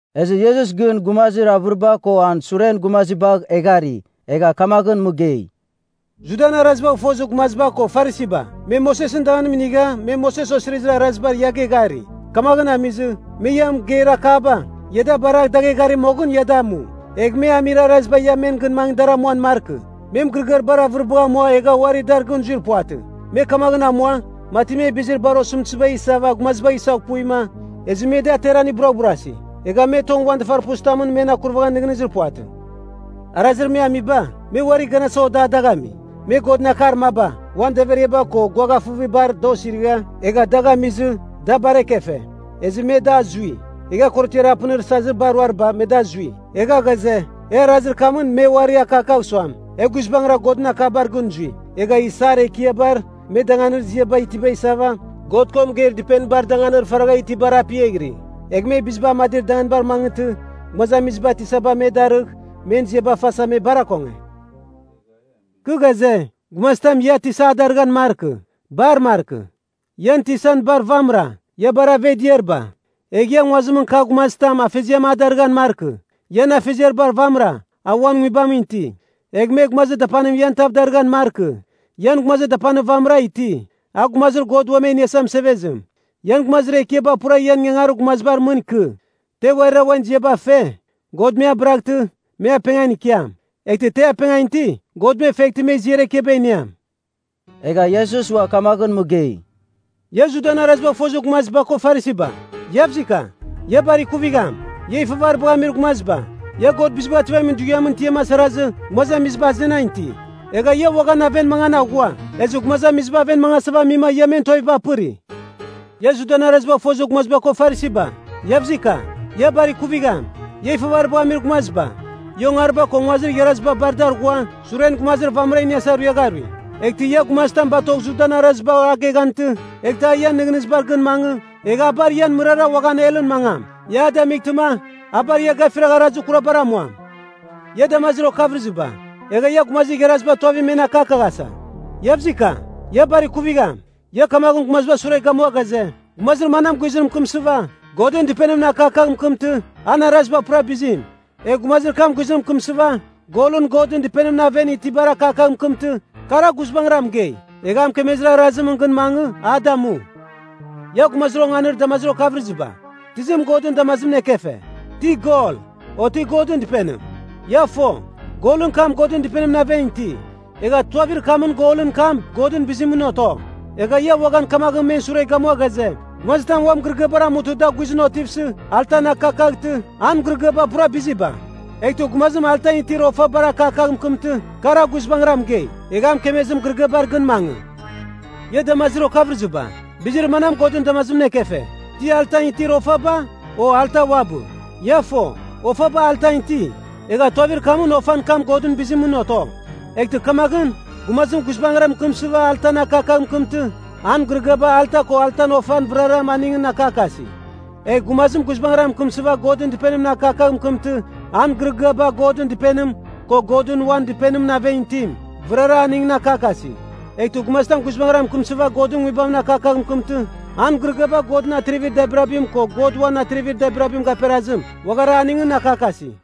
Ezɨ Iesus gɨn gumazir avɨriba ko an suren gumazibagh eghari. Egha kamaghɨn mɨgei, “Judan arazibagh fozir gumaziba ko Farisiba, me Mosesɨn danganim inigha me Moses Osirizir Araziba ia geghari. Kamaghɨn amizɨ, me ia mɨgeir akaba, ia da baragh dagh eghari moghɨn ia damu. Egh me amir araziba ia men gɨn mangɨ dar amuan markɨ. Me mɨgɨrɨgɨar bar avɨribagh amua egha uari dar gɨn zuir puvatɨ. Me kamaghɨn amua, mati me bizir bar osɨmtɨziba isava gumazibagh isaghpuima, ezɨ me da ateran buraghburasi. Egha me tong uan dafarpuzitamɨn men akurvaghan nɨghnɨzir puvatɨ. “Arazir me amiba, me uarir ganasa oda dagh ami. Me Godɨn Akar maba, uan daveriaba ko guaghafɨvibar da osirigha, egha dagh amizɨ, da bar ekefe, ezɨ me da azui. Egha korotiar apɨnir sazir bar ruariba, me da azui. Egha ghaze, e arazir kamɨn me uari akakagh suam, e guizbangɨra Godɨn akabar gɨn zui. Egha isar ekiabar me danganir ziaba itiba isava, God ko mɨgeir dɨpenibar danganir faragha itibar apiaghiri. Egh me biziba amadir danganibar mangɨtɨ, gumazamiziba ‘Tisaba’ me darɨgh, men ziaba fasa me bar akonge. “Kɨ ghaze, gumazitam ia ‘Tisa’ a darɨghan markɨ. Bar markɨ. Ian tisan bar vamɨra, ia bar aveghdiariba. Egh ia nguazimɨn kagh gumazitam ‘Afeziam’ a darɨghan markɨ. Ian Afeziar bar vamɨra, a uan Nguibamɨn iti. Egh me ‘Gumazir Dapanim’ ian tav darɨghan markɨ. Ian Gumazir Dapanir vamɨra iti, a Gumazir God Uam E Iniasa Mɨsevezim. Ian gumazir ekiaba pura ian ingangarir gumazibar mɨn ikɨ. Te uarira uan ziaba fe, God me abɨraghtɨ, me apengan ikiam. Eghtɨ te apengan iti, God me feghtɨ me ziar ekiaba iniam.” Egha Iesus ua kamaghɨn mɨgei, “Ia Judan arazibagh fozir gumaziba ko Farisiba, Iavzika, ia bar ikuvigham! Ia ifavaribagh amir gumaziba! Ia God Bizibagh Ativamin Dughiamɨn tiam asarazɨ, gumazamiziba azenan iti. Egha ia uaghan aven mangan aghua. Ezɨ gumazamiziba aven mangasava amima ia men tuaviba apɨri. “Ia Judan arazibagh fozir gumaziba ko Farisiba, Iavzika! Ia bar ikuvigham! Ia ifavaribagh amir gumaziba! Ia ongariba ko nguazir igharaziba bar dar ghua, suren gumazir vamɨra iniasa ruiagha arui. Eghtɨ ia gumazitam batogh Judabar arazibar a geghantɨ, eghtɨ a ian nɨghnɨzibar gɨn mangɨ, egh a bar ian mɨrara uaghan helɨn mangam. Ia a damightɨma, a bar ia gafiragh arazir kurabar amuam. “Ia damazir okavɨrɨziba, egha ia gumazir igharaziba tuavim men akakaghasa! Iavzika, ia bar ikuvigham! Ia kamaghɨn gumazibar sure gamua ghaze, ‘Gumazir manam guizɨn mɨkɨmsɨva, Godɨn Dɨpenimɨn akakagh mɨkɨmtɨ, an araziba pura bizim. Egh gumazir kam guizɨn mɨkɨmsɨva, golɨn Godɨn Dɨpenimɨn aven itibar akakagh mɨkɨmtɨ, kar a guizbangɨra mɨgei, egha a mɨkemezir arazimɨn gɨn mangɨ, a damu.’ Ia gumazir onganir damazir okavɨrɨziba, tizim Godɨn damazimɨn ekefe? Ti gol, o ti Godɨn Dɨpenim? Ia fo, golɨn kam Godɨn Dɨpenimɨn aven iti, egha tuavir kamɨn golɨn kam Godɨn bizimɨn oto. Egha ia uaghan kamaghɨn men sure gamua ghaze, ‘Gumazitam uan mɨgɨrɨgɨabar amutɨ da guizɨn otivsɨ, altan akakaghtɨ, an mɨgɨrɨgɨaba pura biziba. Eghtɨ gumazim altan itir ofabar akakagh mɨkɨmtɨ, kar a guizbangɨra mɨgei, egh a mɨkemezir mɨgɨrɨgɨabar gɨn mangɨ.’ Ia damazir okavɨrɨziba, bizir manam Godɨn damazimɨn ekefe, ti altan itir ofaba, o alta uabɨ? Ia fo, ofaba altan iti, egha tuavir kamɨn ofan kam Godɨn bizimɨn oto. Eghtɨ kamaghɨn, gumazim guizbangɨra mɨkɨmsɨva altan akakagh mɨkɨmtɨ, an mɨgɨrɨgɨaba alta ko altan ofaba vɨrara aningɨn akakasi. Egh gumazim guizbangɨra mɨkɨmsɨva Godɨn Dɨpenimɨn akakagh mɨkɨmtɨ, an mɨgɨrɨgɨaba Godɨn Dɨpenim, ko Godɨn uan Dɨpenimɨn aven itim, vɨrara aningɨn akakasi. Eghtɨ gumazitam guizbangɨra mɨkɨmsɨva Godɨn Nguibamɨn akakagh mɨkɨmtɨ, an mɨgɨrɨgɨaba Godɨn atrivir dabirabim, ko Godɨn uan atrivir dabirabim gaperazim, uaghara aningɨn akakasi.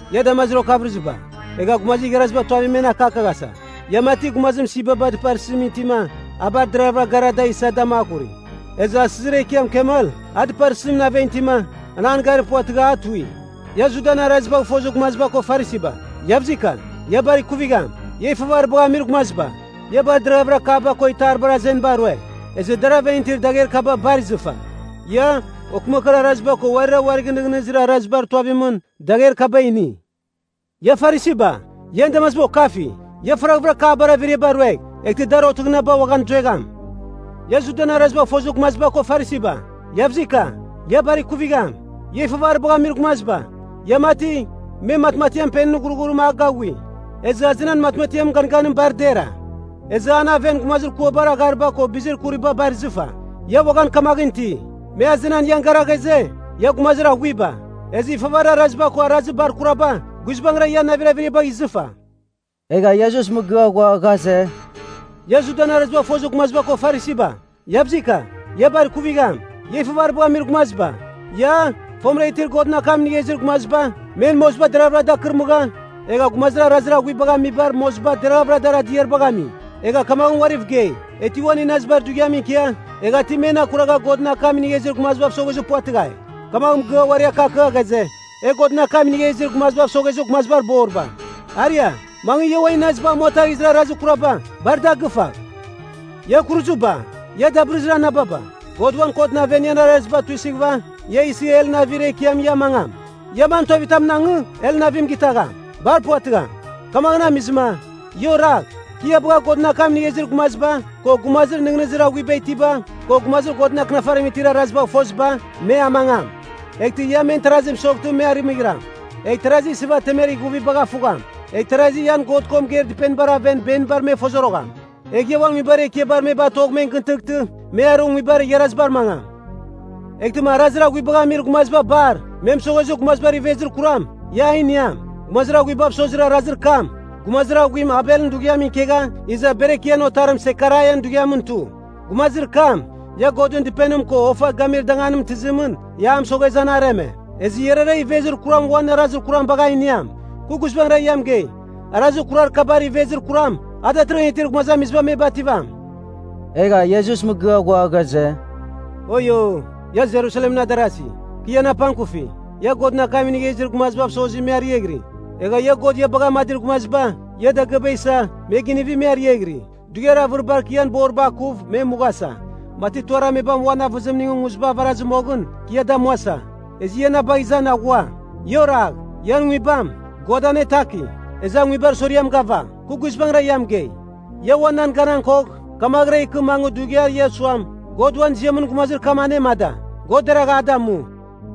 Ia damazir okavɨrɨziba, egha gumazir igharaziba tuavim men akakaghasa! Ia mati, gumazim sibaba dɨparsɨzimɨn itima, a bar deravɨra gara da isa da makuri. Ezɨ asizir ekiam kamel, a dɨparsɨzimɨn aven itima, an an garir puvatɨgha, a tui. “Ia Judan arazibagh fozir gumaziba ko Farisiba, Iavzika! Ia bar ikuvigham! Ia ifavaribagh amir gumaziba! Ia bar deraghavɨra kapba ko itaribar azeniba rue, ezɨ dar aven itir dagher kaba bar izɨfa. Ia, okɨmakɨar araziba ko uarira uarigh nɨghnɨzir arazibar tuavimɨn, dagher kaba ini. Ia Farisiba, ian damaziba okafi! Ia faraghvɨra kapbar averiaba ruegh, eghtɨ dar otɨghɨnaba uaghan zuegham. “Ia Judan arazibagh fozir gumaziba ko Farisiba, Iavzika! Ia bar ikuvigham. Ia ifavaribagh amir gumaziba! Ia mati, me matmatiam penɨn ghurghurim a gaghui, ezɨ azenan matmatiamɨn ganganim bar dera. Ezɨ an aven gumazir kuabar aghariba ko bizir kuriba bar izɨfa. Ia uaghan kamaghɨn iti. Me azenan ian gara ghaze, ia gumazir aghuiba. Ezɨ ifavarir araziba ko arazir bar kuraba, guizbangɨra ian navir averiabagh izɨfa.” Egha Iesus mɨgɨa ghua ghaze, “Ia Judan arazibagh fozir gumaziba ko Farisiba, Iavzika! Ia bar ikuvigham! Ia ifavaribagh amir gumaziba! Ia, fomɨra itir Godɨn akam inigha izir gumaziba, men moziba deraghvɨra dar kɨrmɨgha, egha gumazir arazir aghuibagh amizibar moziba deraghavɨra dar adiaribagh ami. Egha kamagh uariv gei, ‘E ti uan inazibar dughiamɨn ikia, egha ti men akuragha Godɨn akam inigha izir gumazibav soghezir puvatɨghai.’ kamagh mɨgɨa uari akakagha ghaze, ‘E Godɨn akam inigha izir gumazibav soghezir gumazibar boriba!’ Aria, mangɨ, ia uan inaziba amuataghizir arazir kuraba, bar da gɨfagh! “Ia kuruziba! Ia dabɨrɨzir anababa! God uan kotɨn aven ian araziba tuisɨghɨva, ia isɨ helɨn avir ekiamɨn ia amangam! Ia man tuavitamɨn angɨ, helɨn avim gitagham? Bar puvatɨgham! “Kamaghɨn amizɨma, ia oragh, kɨ ia bagha Godɨn akam inigha izir gumaziba, ko gumazir nɨghnɨzir aghuiba itiba, ko gumazir Godɨn Akɨnafarim itir arazibagh foziba, me amangam. Eghtɨ ia men tarazi mɨsoghtɨ me arɨmɨghiram, egh tarasi isɨva temer ighuvibagh afugham, egh tarazi ian God ko mɨgeir dɨpenibar aven benibar me fozorogham. Egh ia uan nguibar ekiabar me batogh men gɨn tɨghtɨ, me arɨ nguibar igharazibar mangam. Eghtɨma arazir aghuibagh amir gumaziba bar, me mɨsoghezir gumazibar ivezir kuram, ia a iniam. Gumazir aghuibav sozir arazir kam, gumazir aghuim Abelɨn dughiamɨn ikegha, iza Berekian otarim Sekaraian dughiamɨn tu. Gumazir kam, ia Godɨn Dɨpenim ko ofa gamir danganim tɨzimɨn ia a mɨsoghezɨ an areme, ezɨ iarara ivezir kuram uan arazir kuram bagh a iniam. Kɨ guizbangɨra ia mɨgei, arazir kurar kabar ivezir kuram, a datɨrɨghɨn itir gumazamiziba me bativam.” Egha Iesus mɨgɨa ghua ghaze, “Oio, ia Jerusalemɨn adarazi, kɨ ian apangkufi! Ia Godɨn akam inigha izir gumazibav sozi me ariaghɨri, egha God ia bagha amadir gumaziba, ia dagɨaba isa, me ginivi, me ariaghɨri. Dughiar avɨribar kɨ ian boriba akuv me mughasa, mati tuarir amebam uan avɨzimingɨn nguziba avarazɨ moghɨn, kɨ ia damuasa. Ezɨ ia na bagh izan aghua. Ia oragh! Ian nguibam, God anetaki, ezɨ a nguibar soriam gava. Kɨ guizbangɨra ia mɨgei, ia ua nan ganan kogh, kamaghɨra ikɨ mangɨ dughiar ia suam, ‘God uan ziamɨn gumazir kam anemada! God deragh a damu!’”